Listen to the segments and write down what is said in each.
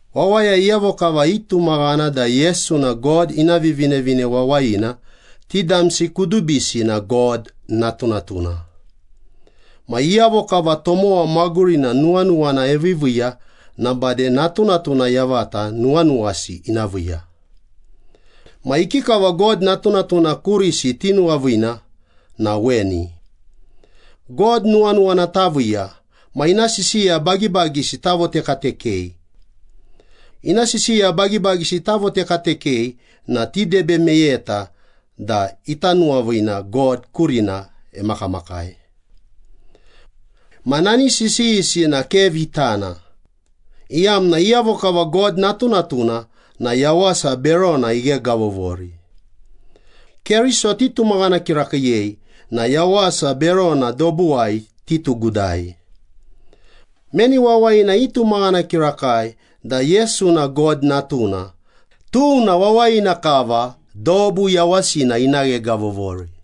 Wawaya iyavo kava itumaghana da Yesu na God ina Vivinevine Wawayina, ti damsi kudubisi na God natunatuna. Ma iyavo kava tomowa magurina nuwanuwana eviiviiya na bade natunatuna yavata nuwanuwasi ina viiya. Ma ikikava God natunatuna kurisi tinuwaviina na weni. God nuwanuwana taviiya ma ina sisiya bagibagisi tavotekatekei. Ina sisiya bagibagisi tavotekatekei na tidebe meyeta da ita nuwaviina God kurina emakamakai. Ma nani sisiyisi na ke vitana, iyamna iyavo kava God natunatuna na yawasa berona ighegavovori. Keriso titumaghana kirakiiyei na yawasa berona dobuwai titugudai. Meni wawayina itumaghana kirakai da Yesu na God Natuna, tuna wawayina kava dobu yawasina ina ghegavovori.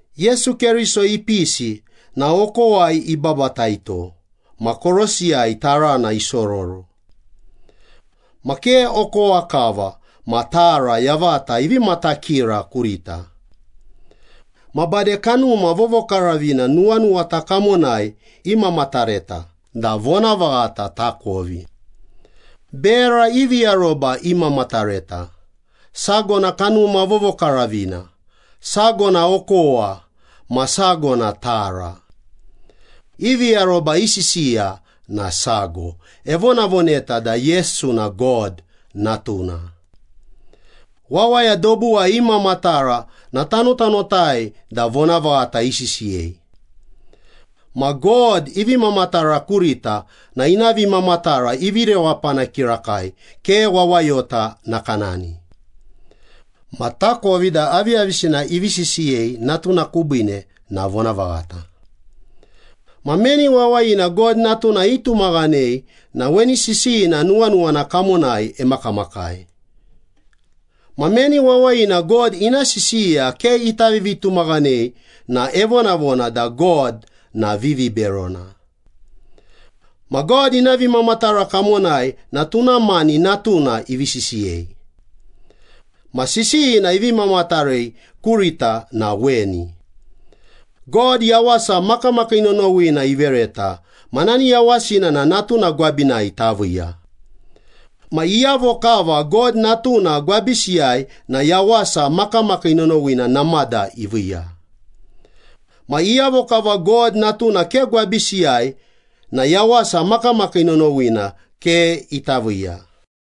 Yesu Keriso ipisi na okowai ibabataito ma korosiyai tarana isororo. Ma ke okowa kava, ma tara yavata ivi matakira kurita. Ma bade Kanuma Vovokaravina nuwanuwata kamonai imamatareta da vonavaghata takovi. Bera ivi aroba imamatareta, sago na Kanuma Vovokaravina, sago na okowa, ma sago na tara. Ivi aroba i sisiya na sago, evonavoneta da Yesu na God Natuna. Wawaya dobuwai imamatara na tanotanotai da vonavaghata isisiyei. Ma God ivi mamatara kurita na ina vimamatara ivi rewapana kirakai, ke wawayota nakanani. Ma takovi da aviyavisina ivi sisiyei Natuna kubiine na vonavaghata. Ma meni wawayina God Natuna itumaghanei na weni sisiyina nuwanuwana kamonai emakamakai. Ma meni wawayina God ina sisiya ke ita vivitumaghanei na evonavona da God na viviberona. Ma God ina vimamatara kamonai na tuna mani Natuna ivi sisiyei. Ma sisiyina ivi mamatarei kurita na weni. God yawasa makamakii nonowina ivereta ma nani yawasina na Natuna gwabinai taviiya. Ma iyavo kava God Natuna gwabisiyai na yawasa makamakii nonowina namada iviiya. Ma iyavo kava God Natuna ke gwabisiyai na yawasa makamakii nonowina ke ita viiya.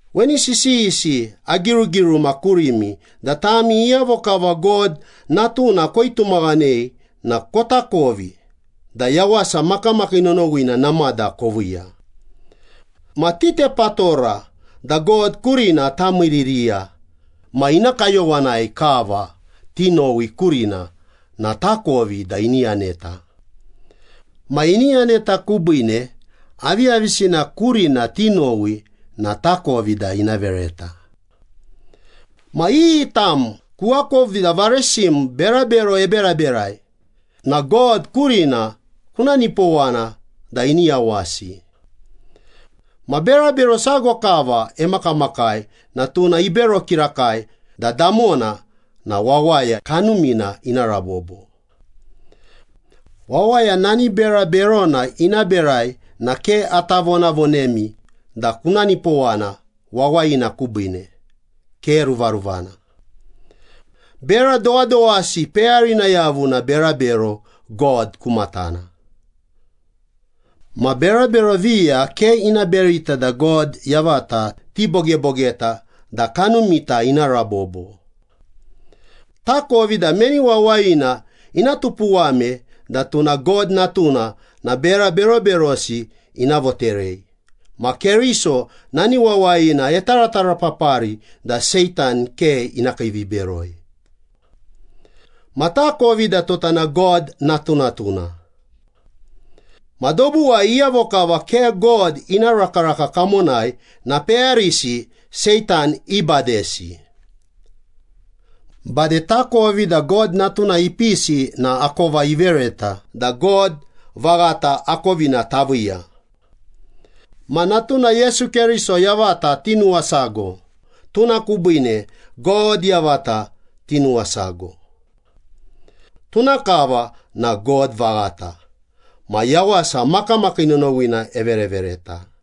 Weni sisiyisi agirugiruma kurimi da tami iyavo kava God Natuna koitumaghanei na kotakovi da yawasa makamakii nonowina namada koviiya. Ma titepatora da God kurina tamiiririya ma ina kayowanai kava tinowi kurina na takovi da ini yaneta. Ma ini yaneta kubiine aviyavisina kurina tinowi na takovi da ina vereta. Ma iyi tam kuakovi da varesim berabero eberaberai na God kurina kuna nipowana da ini yawasi. Ma berabero sago kava emakamakai na tuna ibero kirakai da damona na wawaya kanumina ina rabobo. Wawaya nani bera berona ina berai na ke ata vonavonemi da kuna nipowana wawayina kubiine, ke ruvaruvana. Bera dowadowasi peyarina yavu na berabero God ku matana. Ma berabero viya ke ina berita da God yavata tibogebogeta da kanumita ina rabobo. Takovi da meni wawayina ina tupuwame da tuna God natuna na bera beroberosi ina voterei, ma Keriso nani wawayina etaratarapapari da Seitan ke ina kiiviberoi. Ma takovi da tota na God natunatuna. Ma dobuwai iyavo kava ke God ina rakaraka kamonai na peyarisi Seitan ibadesi. Bade takovi da God Natuna ipisi na akova ivereta da God vaghata akovina taviiya. Ma Natuna Yesu Keriso yavata tinuwasago, tuna kubiine God yavata tinuwasago. Tuna kava na God vaghata ma yawasa makamakii nonowina everevereta.